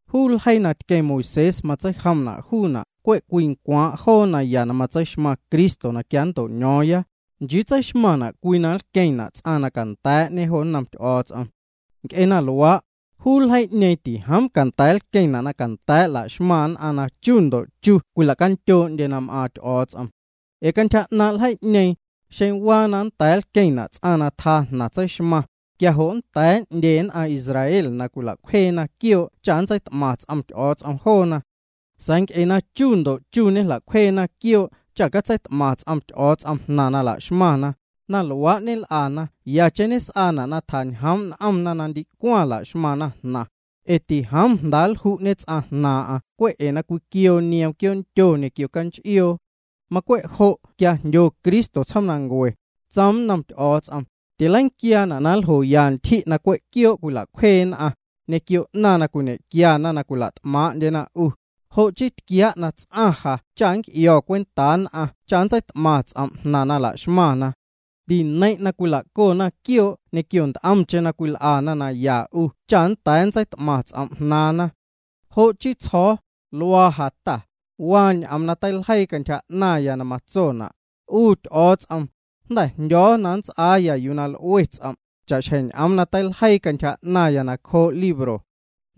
Juu ljeii na tqueⁿ Moisés matseijomna' juuna' cwe' cwii ncwaaⁿ' joo naya na tseixmaⁿ Cristo na quia nnto'ño̱o̱ⁿya, nchii tseixmaⁿna' cwii na nlqueⁿna' ts'aⁿ na canda̱a̱'ñe jo nnom Ty'o̱o̱ts'om. Nc'e na luaa', juu ljeii'ñeeⁿ tijoom canda̱a̱ nlqueⁿna' na canda̱a̱' la'xmaⁿ nn'aⁿ na chu ndo' chu cwilacandyoo'ndyena na m'aaⁿ Ty'o̱o̱ts'om. Ee cantyja 'naaⁿ' ljeii'ñeeⁿ, xeⁿ waa na nnda̱a̱ nlqueⁿna' ts'aⁿ na tjaa jnaⁿ tseixmaaⁿ, quia jo' jnda̱ 'ndye nn'aⁿ Israel na cwila'cwjeena quioo' cha nntseit'maⁿ ts'om Ty'o̱o̱ts'om joona. Sa̱a̱ nc'e na chu ndo' chu ñejla'cwjeena quioo' cha catseit'maⁿ ts'om Ty'o̱o̱ts'om jnaⁿ na laxmaⁿna, na luaa' ñel'ana yacheⁿ s'aana' na tjañjoom' n'omna na ndicwaⁿ laxmaⁿna jnaⁿ, ee tijoom jndaa nlju'ñe ts'aⁿ jnaaⁿ'aⁿ cwe' ee na cwiquioo nioom quioondyo ñequio canch'ioo. Macwe' jo' quia jndyo Cristo tsjoomnancue, tsoom nnom Ty'o̱o̱ts'om: Tileiquiaana' na nljoya ntyji' na cwe' quioo' cwila'cwjee nn'aⁿ, ñequio 'naⁿ na cwiñe'quiana na cwila't'maaⁿ'ndyena 'u. Jo' chii tquiaa' na ts'aⁿ ja cha nnc'io̱ cwentaa nn'aⁿ cha nntseit'maⁿ ts'om' jnaⁿ na la'xmaⁿna. Tineiⁿ' na cwila'cona quioo' ñequio nt'omcheⁿ na cwil'ana naya 'U cha nnda̱a̱ nntseit'maⁿ ts'om' jnaaⁿna. Jo' chii tsjo̱o̱: “Luaa ja Ta, waa ñ'oom na teiljeii cantyja 'naⁿya na matsona': 'U Ty'o̱o̱ts'om, jnda̱ jndyo̱o̱ na nnts'aaya yuu na l'ue' ts'om', cha'xjeⁿ ñ'oom na teiljeii cantyja 'naⁿya nacjoo' libro.”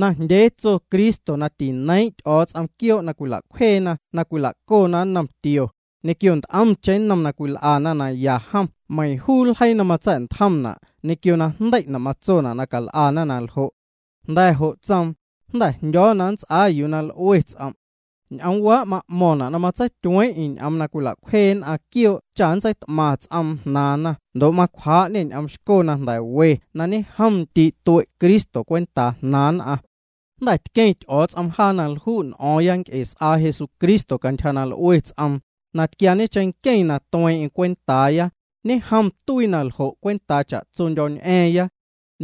Najndyee tso Cristo na tineiiⁿ' Ty'o̱o̱ts'om quioo' na cwila'cwjeena na cwila'cona nnom tio, ñequio nt'omcheⁿ nnom na cwil'ana naya jom meiiⁿ juu ljeii na matsa̱'ntjomna' ñequio najndei'na' matsona' na cal'ana naljo'. Jnda̱ jo' tsoom: “Jnda̱ jndyo̱o̱ na nnts'aa yuu na l'ue ts'om'.” Ñ'oomwaa' ma'mo̱ⁿna' na matseityueeⁿ'eⁿ ñ'oom na cwila'cwjee nn'aⁿ quioo' cha nntseit'maⁿ ts'oom jnaaⁿna ndo' macwjaa'ñê ñ'oom xco na jnda̱ we na ñejom ndii' nncue' Cristo cwentaa jnaaⁿ nn'aⁿ. Jnda̱ tqueⁿ Ty'o̱o̱ts'om jaa na lju' n'o̱o̱ⁿya nc'e s'aa Jesucristo cantyja na l'ue ts'oom, na tquiaañe cheⁿnqueⁿ na tueeⁿ'eⁿ cwentaaya, ñejom tuii na ljo' cwentaa cha'tsondyo̱ñ'a̱a̱ⁿ.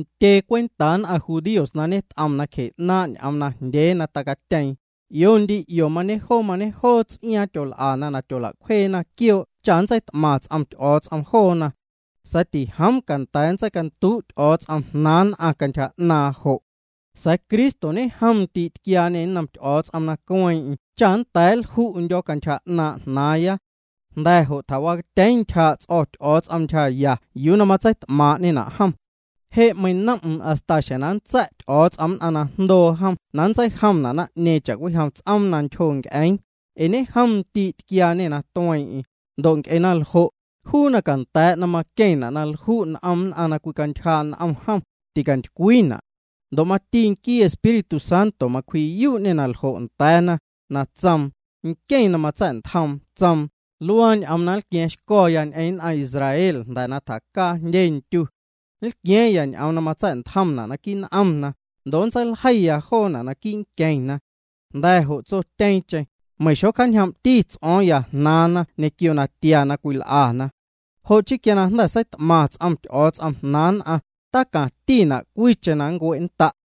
Ntyee cwentaa nn'aⁿ judíos na ñet'om nacje 'naaⁿ' ñ'oom najndyee na tacatyeeⁿtyeⁿ, 'io ndi 'io mañe'joo mañe'joo ts'iaaⁿ tyol'ana na tyola'cwjeena quioo' cha nntseit'maⁿ ts'om Ty'o̱o̱ts'om joona. Sa̱a̱ tijoom canda̱a̱ na nntseicanduu' Ty'o̱o̱ts'om jnaaⁿ nn'aⁿ cantyja 'naaⁿ jo'. Sa̱a̱ Cristo ñejom ndii' tquiaañê nnom Ty'o̱o̱ts'om na cueeⁿ'eⁿ cha nnda̱a̱ nlju'ndyo̱ cantyja 'naaⁿ' jnaaⁿya. Jnda̱ jo' tjawacatyeeⁿ ntyjaa' ts'o̱ Ty'o̱o̱ts'om ntyjaya yuu na matseit'maaⁿ'ñena' jom. Je' meinom'm hasta xjeⁿ na nntsa̱' Ty'o̱o̱ts'om nn'aⁿ na jndoo jom na nntseijomna' naⁿ'ñeeⁿ cha'cwijom ts'oom na ntyjo nc'eeⁿ, ee ñejom ndii' na tquiaañê na tueeⁿ'eⁿ, ndo' nc'e na ljo', juu na canda̱a̱' na maqueⁿna' na lju' n'om nn'aⁿ na cwicantyjaa' n'omna jom, ticantycwiina'. Ndo' mati nquii Espíritu Santo macwji'yuu'ñê na ljo' nda̱a̱ya, na tsoom: Nqueⁿ na matsa̱'ntjoom tsoom: “Luaa ñ'oom na nlqua̱a̱ⁿxco̱ ñ'eⁿ nn'aⁿ Israel jnda̱ na tjacaa jndye ntyu. Nlqua̱a̱ⁿya ñ'oom na matsa̱'ntjomna' quii' n'omna, ndo' nntseiljeiya joona' naquii' nqueⁿna.” Jnda̱ jo' tsotyeeⁿcheⁿ: Meiⁿ xocjaañjoom'ti ts'o̱o̱ⁿya jnaaⁿna ñequio natia na cwil'ana. Jo' chii quia jnda̱ seit'maⁿ ts'om Ty'o̱o̱ts'om jnaaⁿ nn'aⁿ, tacaⁿtina' na cwiicheⁿ nncue'nnda'.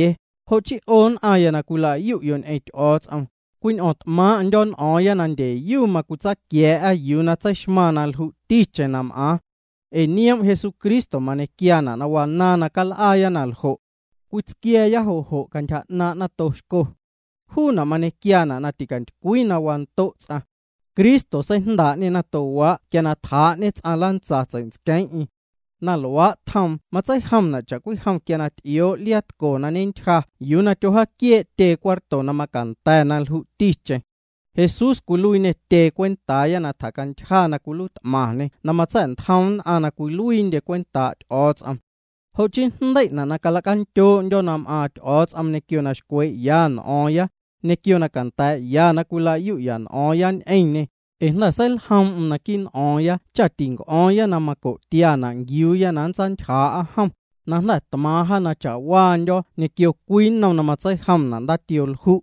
Jo' chii 'o nn'aⁿya na cwila'yu'yo' ñ'eⁿ Ty'o̱o̱ts'om, cwiñ'o̱o̱ⁿt'maaⁿ'ndyo̱ n'o̱o̱ⁿya na ndyeyu macwitsaaquia̱a̱'a yuu na tseixmaⁿ na lju'ticheⁿ na m'aaⁿ. Ee nioom' Jesucristo mañequiaana' na wanaaⁿ na cal'aaya na ljo'. Cwitsquia̱a̱ya jo' jo' cantyja 'naaⁿ' nato xco. Juuna' mañequiaana' na ticantycwii na wando' ts'aⁿ. Cristo seijndaa'ñê natowaa' quia na tjaa'ñe ts'aⁿ lantsa tsei'ntsqueeⁿ'eⁿ. Na luaa' tjoom matseijomna' cha'cwijom quia na t'ioo' liaa tco na ñentyja yuu na tyowjaaquiee' tyee cuarto na macanda̱ na lju'ticheⁿ. Jesús cwiluiiñê tyee cwentaaya na tjacantyja na cwiluiit'maⁿñê na matsa̱'ntjoom nn'aⁿ na cwiluiindye cwentaa' Ty'o̱o̱ts'om. Jo' chii jndei'na' na cala'candyoo'ndyo̱ na m'aaⁿ Ty'o̱o̱ts'om ñequio na xcwee'ya n'o̱o̱ⁿya, ñequio na canda̱a̱'ya na cwila'yu'ya n'o̱o̱ⁿya ñ'eⁿñê, ee jnda̱ seiljoom'm jaa naquii' n'o̱o̱ⁿya cha tinc'o̱o̱ⁿya na maco'tiana' nquiuuya na nntsaantyjaa'a jom, na jnda̱ tmaaⁿ jaa na cha'waandyo̱ ñequio cwii na matseijomna' ndaatioo lju'.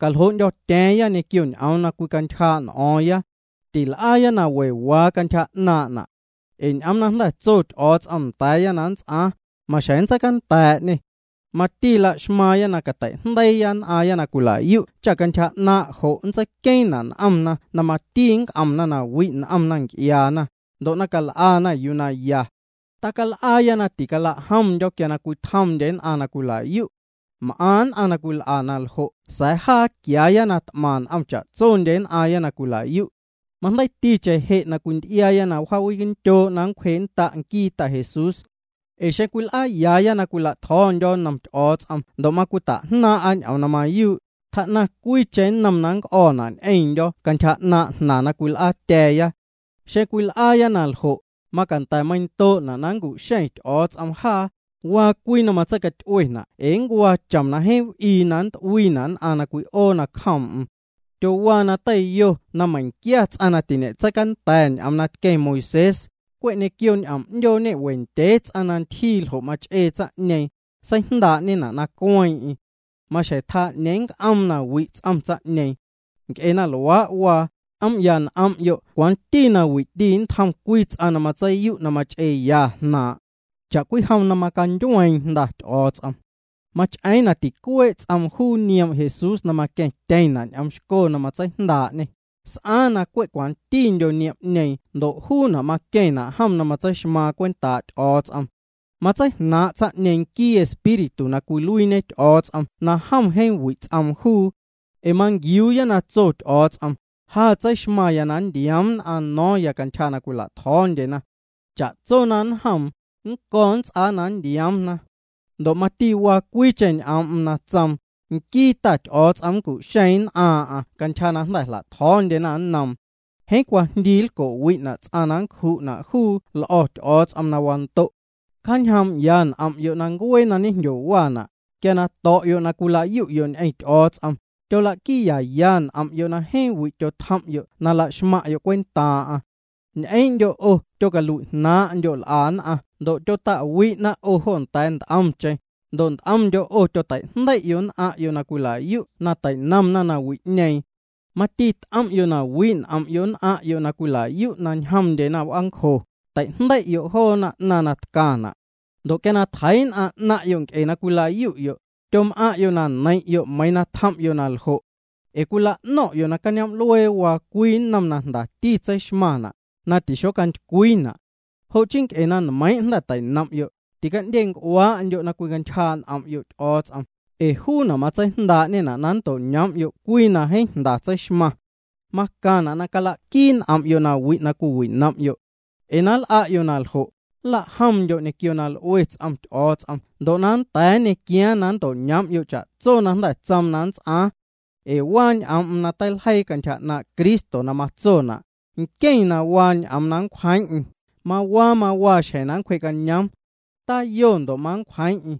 Caljoo'ndyo̱tya̱a̱ⁿya ñequio ñ'oom na cwicantyjaa' n'o̱o̱ⁿya. Til'aaya na we waa cantyja 'naaⁿ'na'. Ee ñ'oom na jnda̱ tso Ty'o̱o̱ts'om nda̱a̱ya na nnts'aaⁿ, maxjeⁿ nntseicanda̱a̱'ñê. Mati la'xmaaⁿya na cateijndeiiya nn'aaⁿya na cwila'yu' cha na cantyja 'naaⁿ' jo' nntseiqueeⁿna' n'omna na mati nnc'omna na wi' n'omna nc'iaana, ndo' na cal'ana yuu na ya. Tacal'aaya na ticala'jomndyo̱ quia cwitjomndye nn'aⁿ na cwila'yu'. M'aⁿ nn'aⁿ na cwil'a na ljo' sa̱a̱ jaa quiaaya na t'maⁿ n'om cha'tsondye nn'aⁿ na cwila'yu'. Majndeiiticheⁿ je' na cwinty'iaaya na wjaawindyoo' na nncwjee'nnda' nquii Ta Jesús. Ee xeⁿ cwil'aayaaya na nla'tjo̱o̱ndyo̱ nnom Ty'o̱o̱ts'om ndo' macwita'jnaaⁿ'a ñ'oom na mayuu', tjaa'naⁿ cwiicheⁿ nnom na nnc'o̱ juuna' ñequiondyo̱ cantyja 'naaⁿ' jnaⁿ na cwil'aatya̱a̱ya. Xeⁿ cwil'aaya na ljo', macanda̱ meiⁿndoo'na' na nncu'xeⁿ Ty'o̱o̱ts'om jaa, ee waa cwii na matseicaty'uena' ee ncuaa chom na jeeⁿ w'ii na nnt'uiina' nn'aⁿ na cwi'oo nacjoom'm. Tyowaa na teiyo na meiⁿquia ts'aⁿ na tiñe'catseicanda̱ ñ'oom na tqueⁿ Moisés, cwe' ñequio ñ'oom 'ndyoo meiiⁿ ñe'we ndyee ts'aⁿ na ntyjii na ljo' mach'ee tsaⁿ'ñeeⁿ, seijndaa'ñena' na cueeⁿ'eⁿ. Maxjeⁿ tjaa 'ñeeⁿ nnc'oom na wi' ts'om tsaⁿ'ñeeⁿ. Nc'e na luaa' waa, c'oom'ya n'om'yo' cwanti na wi'ti nntjom cwii ts'aⁿ na matseiyu' na mach'eeya jnaaⁿ'. Cha'cwijom macandyueeⁿ Jnda Ty'o̱o̱ts'om. Mach'eeⁿ na ticuee' ts'oom na juu nioom' Jesús na maqueⁿtyeⁿna' ñ'oom xco na matseijndaa'ñê, s'aaⁿ na cwe' cwantindyo niom'ñeeⁿ ndo' juuna' maqueⁿna' jom na tseixmaaⁿ cwentaa' Ty'o̱o̱ts'om. Matseijnaaⁿ' tsaⁿ'ñeeⁿ nquii Espíritu na cwiluiiñe Ty'o̱o̱ts'om na jom jeeⁿ wi' ts'oom juu. Ee manquiuuya na tso Ty'o̱o̱ts'om: “Ja tseixmaⁿya na nntioom nn'aⁿ no̱o̱ⁿya cantyja na cwila'tjo̱o̱ndyena. Cha'tso na nnjoom, nnco̱ nnts'aa na nntioomna.” Ndo' mati waa cwiicheⁿ ñ'oom na tsoom: “Nquii Ta Ty'o̱o̱ts'om nncu'xeeⁿ nn'aaⁿ'aⁿ cantyja na jnda̱ jla'tjo̱o̱ndyena nnoom.” Jeeⁿ cwajndii nlco'wi'na' ts'aⁿ na nncju'na' juu l'o̱ Ty'o̱o̱ts'om na wando'. Cjaañjoom'ya n'om'yo' ncuee na ñejndyocaana', quia na to̱'yo' na cwila'yu'yo' ñ'eⁿ Ty'o̱o̱ts'om, tyola'quiiyaya n'om'yo' na jeeⁿ wi' tyotjom'yo' na la'xmaⁿ'yo' cwentaaⁿ'aⁿ. Ñ'eeⁿ'ndyo 'o na tyocalui'jnaaⁿ'ndyo' l'a nn'aⁿ ndo' na tyota'wi'na 'o jo nda̱a̱ nt'omcheⁿ, ndo' nt'omndyo' 'o tyoteijndei'yo' nn'aⁿ'yo' na cwila'yu' na teinomna nawi'ñeeⁿ. Mati t'om'yo' na wi' n'om'yo' nn'aⁿ'yo' na cwila'yu' na too'ndyena w'aancjo, teijndei'yo' joona 'naⁿ na ñetcaⁿna'. Ndo' quia tjeii' nn'aⁿ 'naⁿ'yo' nc'e na cwila'yu'yo', tyom'aⁿ'yo' na neiⁿ'yo' meiiⁿ na tjom'yo' na ljo'. Ee cwila'no̱ⁿ'yo' na cañoom'luee waa cwii nnom na jndati tseixmaⁿna', na tixontycwiina'. Jo' chii nc'e na nmeiⁿ' jnda̱ teinom'yo', tica'ndyenc'uaa'ndyo' na cwicantyjaa' n'om'yo' Ty'o̱o̱ts'om, ee juuna' matseijndaa'ñena' na nnto'ñoom'yo' cwii na jeeⁿ jnda tseixmaⁿ. Macaⁿna' na cala'quii n'om'yo' nawi' na cwiwinom'yo'. Ee na nl'a'yo' na ljo', nla'jomndyo' ñequio na l'ue ts'om Ty'o̱o̱ts'om ndo' na nnda̱a̱ nñequiaaⁿ na nnto'ñoom'yo' cha'tso na jnda̱ tsoom na nnts'aaⁿ. Ee waa ñ'oom'm na teiljeii cantyja 'naaⁿ' Cristo na matsona': Nqueⁿ na waa ñ'oom na nncwjeeⁿ'eⁿ, mawaa mawaa xjeⁿ na nncwjee'cañoom. Tayo mancwjeeⁿ'eⁿ.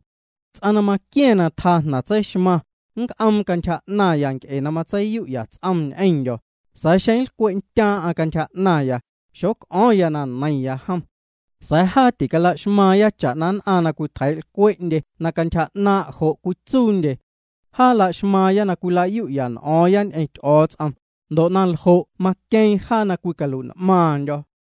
Ts'aⁿ na maqua̱ⁿ na tjaa jnaⁿ tseixmaⁿ, nnc'oom cantyja 'naⁿya nc'e na matseiyu'ya ts'oom ñ'eⁿndyo̱; sa̱a̱ xeⁿ lcwe'ntyaaⁿ'aⁿ cantyja 'naⁿya, xoc'o̱o̱ⁿya na neiⁿya jom. Sa̱a̱ jaa ticala'xmaaⁿya cha'na nn'aⁿ na cwitjeii'lcwee'ndye na cantyja 'naaⁿ' jo' cwitsuundye. Jaa la'xmaaⁿya nn'aⁿ na cwila'yu'ya n'o̱o̱ⁿya ñ'eⁿ Ty'o̱o̱ts'om, ndo' na ljo' maqueeⁿ jaa na cwicalui'n'maaⁿndyo̱.